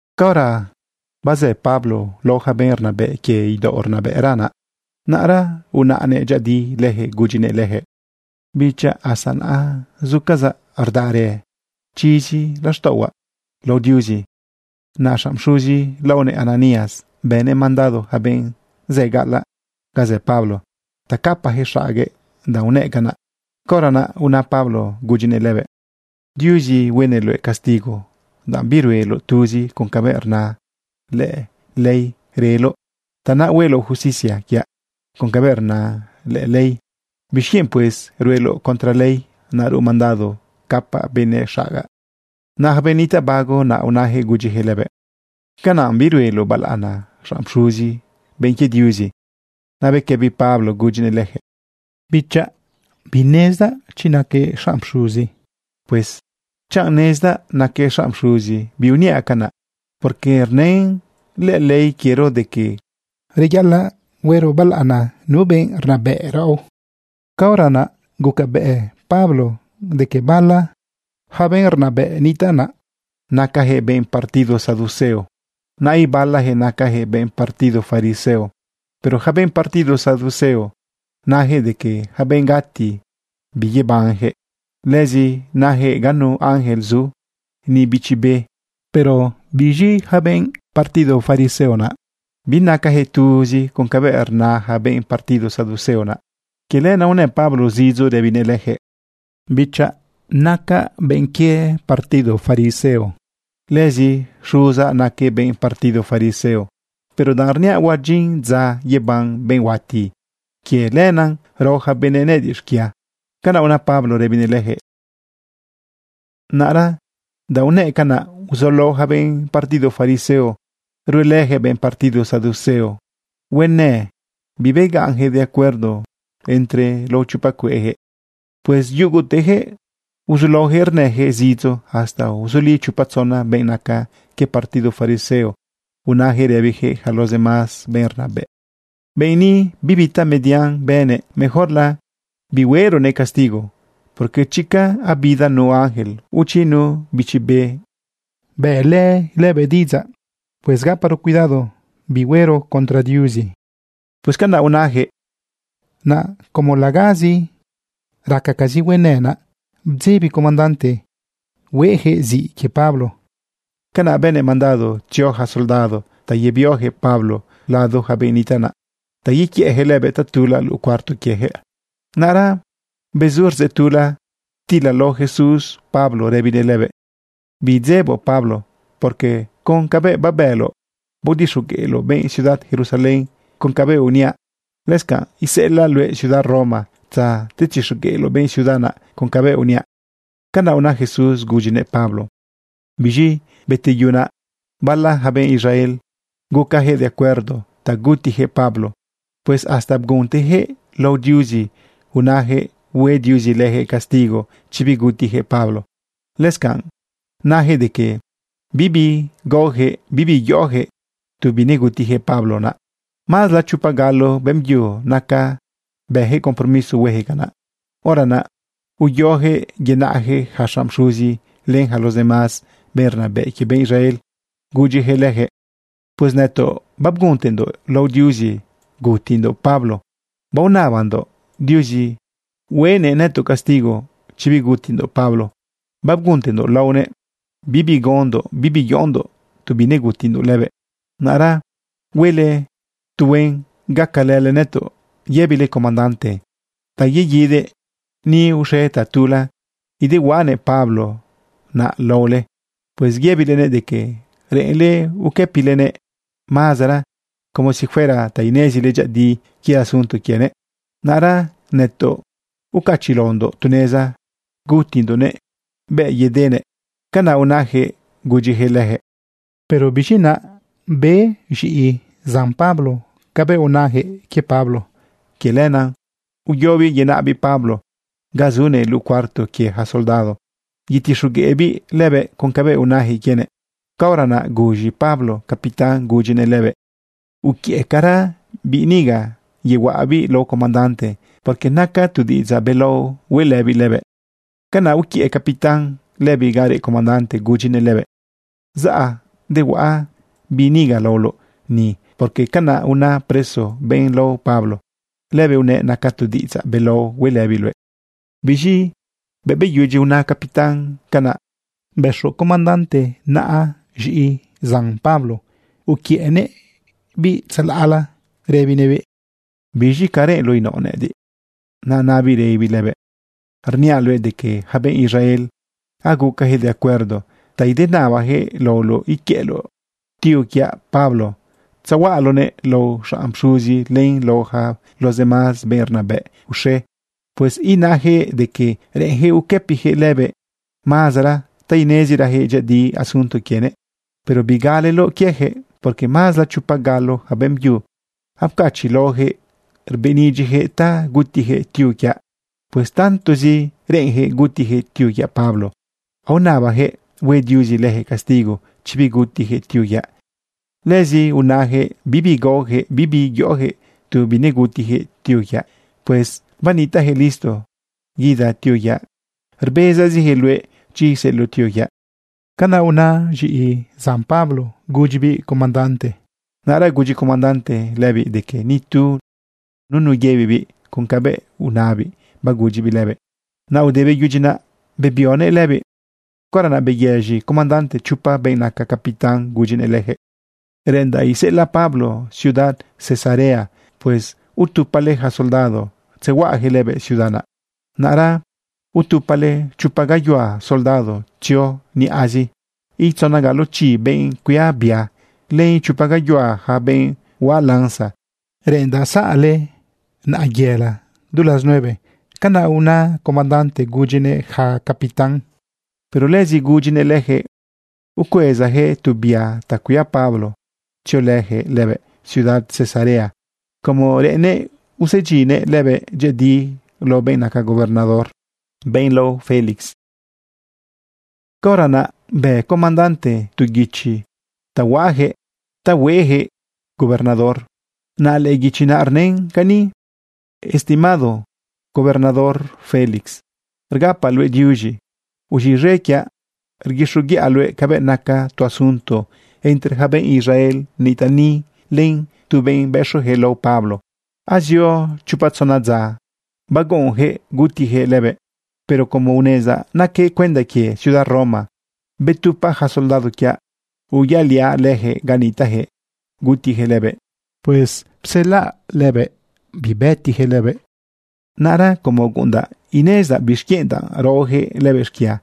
Caora bazë Pablo lao ja benꞌ rnabë quie idaoꞌ rnabëꞌra naꞌ, naꞌra unaꞌnëꞌ dyëꞌëdi leyaquëꞌ gudyinëꞌ lejëꞌ: ―Bichaꞌ, hasta naꞌ zucazaꞌ rdaꞌa reꞌ chizi laxtaꞌohuaꞌ lao Diuzi. Naꞌ xanꞌ pxuzi laonëꞌ Ananías, bënëꞌ mandado yaca benꞌ zë gaꞌalaꞌ ga zë Pablo ta capayaquëꞌ xaguëꞌ danꞌ unëꞌ canaꞌ. Caora naꞌ una Pablo gudyinëꞌ lëbëꞌ: ―¡Diuzi huenëꞌ luëꞌ castigo danꞌ birueloꞌ tuzi con cabëꞌ rna lëꞌë ley. Reꞌloꞌ naꞌ ta hueloꞌ justicia quiaꞌ con cabëꞌ rna lëꞌë ley, ¿bixquienꞌ, pues, rueloꞌ contra ley naꞌ, ruꞌ mandado capa benëꞌ xagaꞌ? Naꞌ yaca benꞌ nitaꞌ bago naꞌ unajëꞌ gudyijëꞌ lëbëꞌ: ―¿Canaꞌ birueloꞌ balaꞌana xanꞌ pxuzi, benꞌ quie Diuzi? Naꞌ bequëbi Pablo gudyinëꞌ lejëꞌ: ―Bichaꞌ, binezdaꞌ chi naquëꞌ xanꞌ pxuzi. Pues chanꞌ nezdaꞌ naquëꞌ xanꞌ pxuzi, biuniaꞌ canaꞌ, porque rnën lëꞌë ley quiero de que: “Reyaꞌalaꞌ huero balaꞌana nu benꞌ rnabëꞌ quiero.” Caora naꞌ gucabëꞌ Pablo de que bala ja benꞌ rnabëꞌ nitaꞌ naꞌ nacajëꞌ benꞌ partido saduceo, naꞌ ibalajëꞌ nacajëꞌ benꞌ partido fariseo. Pero yaca benꞌ partido saduceo nayaquëꞌ de que yaca benꞌ gati biyebanjëꞌ. Lëzi nayaquëꞌ ganu ángel zu, ni bichi be. Pero biz̃i yaca benꞌ partido fariseo naꞌ, binacayaquëꞌ tuzi con cabëꞌ rna ja benꞌ partido saduceo naꞌ. Quie lenaꞌ unë Pablo zidzo rëbinëꞌ leyaquëꞌ: ―Bichaꞌ, nacaꞌ benꞌ quie partido fariseo. Lëzi xuzaꞌ naquëꞌ benꞌ partido fariseo. Pero danꞌ rniaꞌ huadyin dza yeban benꞌ huati, quie lenaꞌ rao yaca benëꞌ nëꞌëdiꞌ xquia. Canaꞌ una Pablo rëbinëꞌ lejëꞌ. Naꞌra danꞌ unëꞌ canaꞌ, uzulao ja benꞌ partido fariseo ruelëyaquëꞌ benꞌ partido saduceo huenë. Bibegaꞌnyaquëꞌ de acuerdo entre lao chopa cueꞌyaquëꞌ. Pues yugutejëꞌ uzulaojëꞌ rnëjëꞌ zidzo hasta uzuli chopa tzona benꞌ naca quie partido fariseo, unayaquëꞌ rëbiyaquëꞌ yaca los demás benꞌ rnabëꞌ: ―Benꞌ ni, bibi tamedian bënëꞌ. Mejorla bihueronëꞌ castigo, porque chica abida nu ángel o chi nu bichi be bëꞌlë lëbëꞌ diꞌidzaꞌ. Pues gaparo cuidado bihuero contra Diuzi. ―Pues canaꞌ unayaquëꞌ. Naꞌ como legazi racagazi huenë naꞌ, bdzebi comandante hueyaquëꞌ ziꞌ quie Pablo. Canaꞌ bënëꞌ mandado tzio yaca soldado ta yebioyaquëꞌ Pablo lado ja benꞌ nitaꞌ naꞌ ta yequiëꞌyaquëꞌ lëbëꞌ tatula luꞌu cuarto quiejëꞌ. Naꞌra bezu rdzeꞌ tula, ptilalao Jesús Pablo rëbinëꞌ lëbëꞌ: ―Bidzeboꞌ, Pablo, porque con cabëꞌ babëloꞌ baodixogueꞌloꞌ benꞌ ciudad Jerusalén con cabëꞌ uniaꞌ, lëscanꞌ iseꞌelaꞌ luëꞌ ciudad Roma ta tzetixogueꞌloꞌ benꞌ ciudad naꞌ con cabëꞌ uniaꞌ. ―Canaꞌ una Jesús gudyinëꞌ Pablo. Biz̃i beteyu naꞌ, bala ja benꞌ Israel gucayaquëꞌ de acuerdo ta gutiyaquëꞌ Pablo. Pues hasta bguntejëꞌ lao Diuzi unajëꞌ hue Diuzi leyaquëꞌ castigo chi bigutiyaquëꞌ Pablo. Lëscanꞌ nayaquëꞌ de que bibi gaoyaquëꞌ, bibi yoꞌoyaquëꞌ tu binegutijëꞌ Pablo naꞌ. Mazla chopa galo beꞌmbyu naca bëjëꞌ compromiso huejëꞌ canaꞌ. Hora naꞌ uyoyaquëꞌ yenaꞌyaquëꞌ yaca xanꞌ pxuzi len yaca los demás benꞌ rnabëꞌ quie benꞌ Israel gudyijëꞌ lejëꞌ: ―Pues nëtoꞌ babguntendoꞌ lao Diuzi gutindoꞌ Pablo. Baonabandoꞌ Diuzi huenëꞌ nëtoꞌ castigo chi bigutindoꞌ Pablo. Babguntendoꞌ laonëꞌ bibi gaondoꞌ, bibi yoꞌondoꞌ tu binegutindoꞌ lëbëꞌ. Naꞌra huele tuhuen gacalële nëtoꞌ. Yëbile comandante ta yeguidëꞌ ni uxe tatula, idehuaꞌanëꞌ Pablo naꞌ laole. Pues yëbilenëꞌ de que reꞌenle uquëpilenëꞌ mazera como si fuera ta inezile dyëꞌëdi quie asunto quienëꞌ. Naꞌra nëtoꞌ ucachiꞌlaondoꞌ tu neza gutindoꞌnëꞌ bëꞌ yedenëꞌ. ―Canaꞌ unajëꞌ gudyijëꞌ lejëꞌ. Pero biz̃i naꞌ, be z̃iꞌi zan Pablo cabëꞌ unajëꞌ quie Pablo. Quie lenaꞌ uyobiꞌ yenaꞌbiꞌ Pablo ga zunëꞌ luꞌu cuarto quie ja soldado yetixogueꞌbiꞌ lëbëꞌ con cabëꞌ unayaquëꞌ quienëꞌ. Caora naꞌ guz̃i Pablo capitán gudyinëꞌ lëbëꞌ: ―Uquiëꞌcara biꞌ niga yehuaꞌabiꞌ lao comandante, porque naca tu diꞌidzaꞌ belao hueꞌlëbiꞌ lëbëꞌ. Canaꞌ uquiëꞌ capitán lëbiꞌ ga reꞌ comandante gudyinëꞌ lëbëꞌ: ―Zaꞌ dehuaꞌa biꞌ niga laoloꞌ ni, porque canaꞌ una preso, benꞌ lao Pablo. Lëbëꞌ unëꞌ naca tu diꞌidzaꞌ belao hueꞌlëbiꞌ luëꞌ. Biz̃i bëꞌ beyudyi una capitán canaꞌ, bëxo comandante naꞌa z̃iꞌi zan Pablo uquiëꞌnëꞌbiꞌ tzalaꞌla rëbinëꞌbiꞌ: ―¿Biz̃i ca reꞌenloꞌ inaoꞌ nëꞌëdiꞌ? Naꞌ nabiꞌ rëbibiꞌ lëbëꞌ: ―Rniaꞌ luëꞌ de que yaca benꞌ Israel, agucayaquëꞌ de acuerdo ta idenabajëꞌ laoloꞌ iquiëꞌloꞌ tío quiaꞌ Pablo, tzehuaꞌaloꞌnëꞌ lao xanꞌ pxuzi len lao yaca los demás benꞌ rnabëꞌ uxe. Pues inayaquëꞌ de que reꞌenyaquëꞌ uquëpiyaquëꞌ lëbëꞌ mazera ta inezirajëꞌ dyëꞌëdi asunto quienëꞌ. Pero bigaleloꞌ quieyaquëꞌ, porque mazla chopa galo yaca beꞌmbyu apcachiꞌlaojëꞌ rbëꞌnidyiyaquëꞌ ta gutiyaquëꞌ tío quiaꞌ. Pues tantozi reꞌenyaquëꞌ gutiyaquëꞌ tío quiaꞌ Pablo, aonabayaquëꞌ hue Diuzi leyaquëꞌ castigo chi bigutiyaquëꞌ tío quiaꞌ. Lëzi unayaquëꞌ bibi gaojëꞌ, bibi yoꞌojëꞌ tu binegutiyaquëꞌ tío quiaꞌ. Pues banitaꞌjëꞌ listo guida tío quiaꞌ. Rbezazijëꞌ luëꞌ chi iseꞌeloꞌ tío quiaꞌ. ―Canaꞌ una z̃iꞌi zan Pablo gudyibiꞌ comandante. Naꞌra gudyi comandante lëbiꞌ de que nitu nunu yëbibiꞌ con cabëꞌ unabiꞌ bagudyibiꞌ lëbëꞌ. Naꞌ ude beyudyi naꞌ, bebionëꞌ lëbiꞌ. Caora naꞌ beyëz̃i comandante chopa benꞌ naca capitán gudyinëꞌ lejëꞌ: ―Reꞌendaꞌ iseꞌelaꞌ Pablo ciudad Cesarea. Pues utupale yaca soldado tzehuaꞌayaquëꞌ lëbëꞌ ciudad naꞌ. Naꞌra utupale chopa gayuhua soldado tzio niꞌazi, len itzona galo chi benꞌ cuia bia, len ichopa gayuhua yaca benꞌ huaꞌ lanza. Reꞌendaꞌ zaꞌle naꞌa yëla du las nueve. ―Canaꞌ una comandante gudyinëꞌ yaca capitán. Pero lëzi gudyinëꞌ lejëꞌ ucuezayaquëꞌ tu bia ta cuia Pablo tziolëyaquëꞌ lëbëꞌ ciudad Cesarea como reꞌennëꞌ usedyinyaquëꞌ lëbëꞌ dyëꞌëdi lao benꞌ naca gobernador, benꞌ lao Félix. Caora naꞌ bë comandante tu guichi ta huaꞌajëꞌ ta hueꞌjëꞌ gobernador. Naꞌ lëꞌë guichi rnën cani: “Estimado gobernador Félix, rgapaꞌ luëꞌ diuz̃i. Uz̃iꞌz̃e quiaꞌ rguixoguiꞌa luëꞌ cabëꞌ naca tu asunto entre ja benꞌ Israel nitaꞌ ni, len tu benꞌ bëxojëꞌ lao Pablo. Azio chopa tzona dza baguꞌunyaquëꞌ gutijëꞌ lëbëꞌ. Pero como unezdaꞌ naquëꞌ cuenda quie ciudad Roma, betupaꞌ ja soldado quiaꞌ uyaꞌliaꞌ leyaquëꞌ ga nitaꞌjëꞌ gutijëꞌ lëbëꞌ. Pues pselaꞌ lëbëꞌ bibëtijëꞌ lëbëꞌ. Naꞌra como guꞌundaꞌ inezidaꞌ bixquienꞌ danꞌ raoyaquëꞌ lëbëꞌ xquia,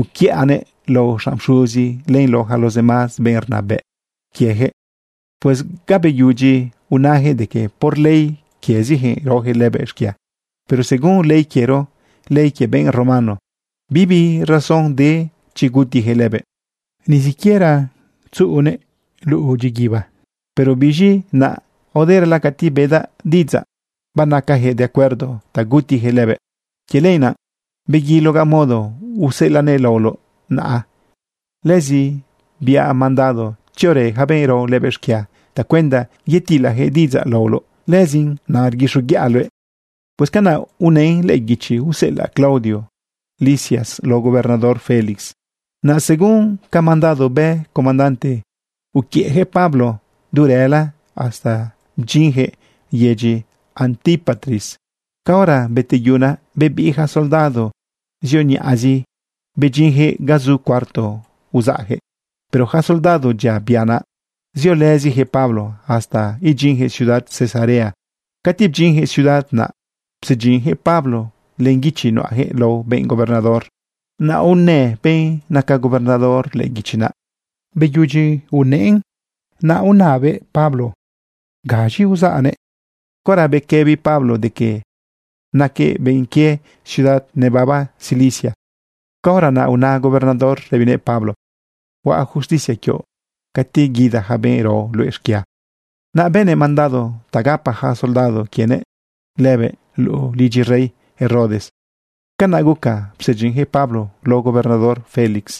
uquiꞌanëꞌ lao xanꞌ pxuzi len lao yaca los demás benꞌ rnabëꞌ quiejëꞌ. Pues ga beyudyi unayaquëꞌ de que por ley quieziyaquëꞌ raojëꞌ lëbëꞌ xquia. Pero según ley quiero, ley quie benꞌ romano, bibi razón de chi gutiyaquëꞌ lëbëꞌ, ni siquiera tzuꞌugalanëꞌ luꞌu dyiguiba. Pero biz̃i naꞌ aoderala cati bedaꞌ diꞌidzaꞌ banacayaquëꞌ de acuerdo ta gutijëꞌ lëbëꞌ. Quie lenaꞌ beguilogaꞌ modo useꞌelaꞌnëꞌ laoloꞌ naꞌ. Lëzi biaꞌ mandado tziorë yaca benꞌ rao lëbëꞌ xquia tacuenda yetilajëꞌ diꞌidzaꞌ laoloꞌ. Lëzin naꞌ rguixoguiꞌa luëꞌ.” Pues canaꞌ unën lëꞌë guichi useꞌelaꞌ Claudio Lisias lao gobernador Félix. Naꞌ según ca mandado bë comandante, uquiëꞌyaquëꞌ Pablo du rëla hasta bdyinyaquëꞌ yedyi Antípatris. Caora beteyu naꞌ, bebiꞌ yaca soldado zio niꞌazi bedyinyaquëꞌ ga zu cuarto uzaꞌyaquëꞌ. Pero yaca soldado dyia bia naꞌ, ziolëziyaquëꞌ Pablo hasta idyinjëꞌ ciudad Cesarea. Cati bdyinyaquëꞌ ciudad naꞌ, psedyinyaquëꞌ Pablo len guichi nuꞌajëꞌ lao benꞌ gobernador. Naꞌ unë benꞌ naca gobernador lëꞌë guichi naꞌ. Beyudyi unëꞌn naꞌ, unabëꞌ Pablo gaz̃i uzaꞌnëꞌ. Caora bequëbi Pablo de que naquëꞌ benꞌ quie ciudad nebaba Cilicia, caora naꞌ una gobernador rëbinëꞌ Pablo: ―Huaꞌ justicia quioꞌ cati guida ja benꞌ rao luëꞌ xquia. Naꞌ bënëꞌ mandado ta gapa yaca soldado quienëꞌ lëbëꞌ luꞌu lidyi rey Herodes. Canaꞌ guca psedyinyaquëꞌ Pablo lao gobernador Félix.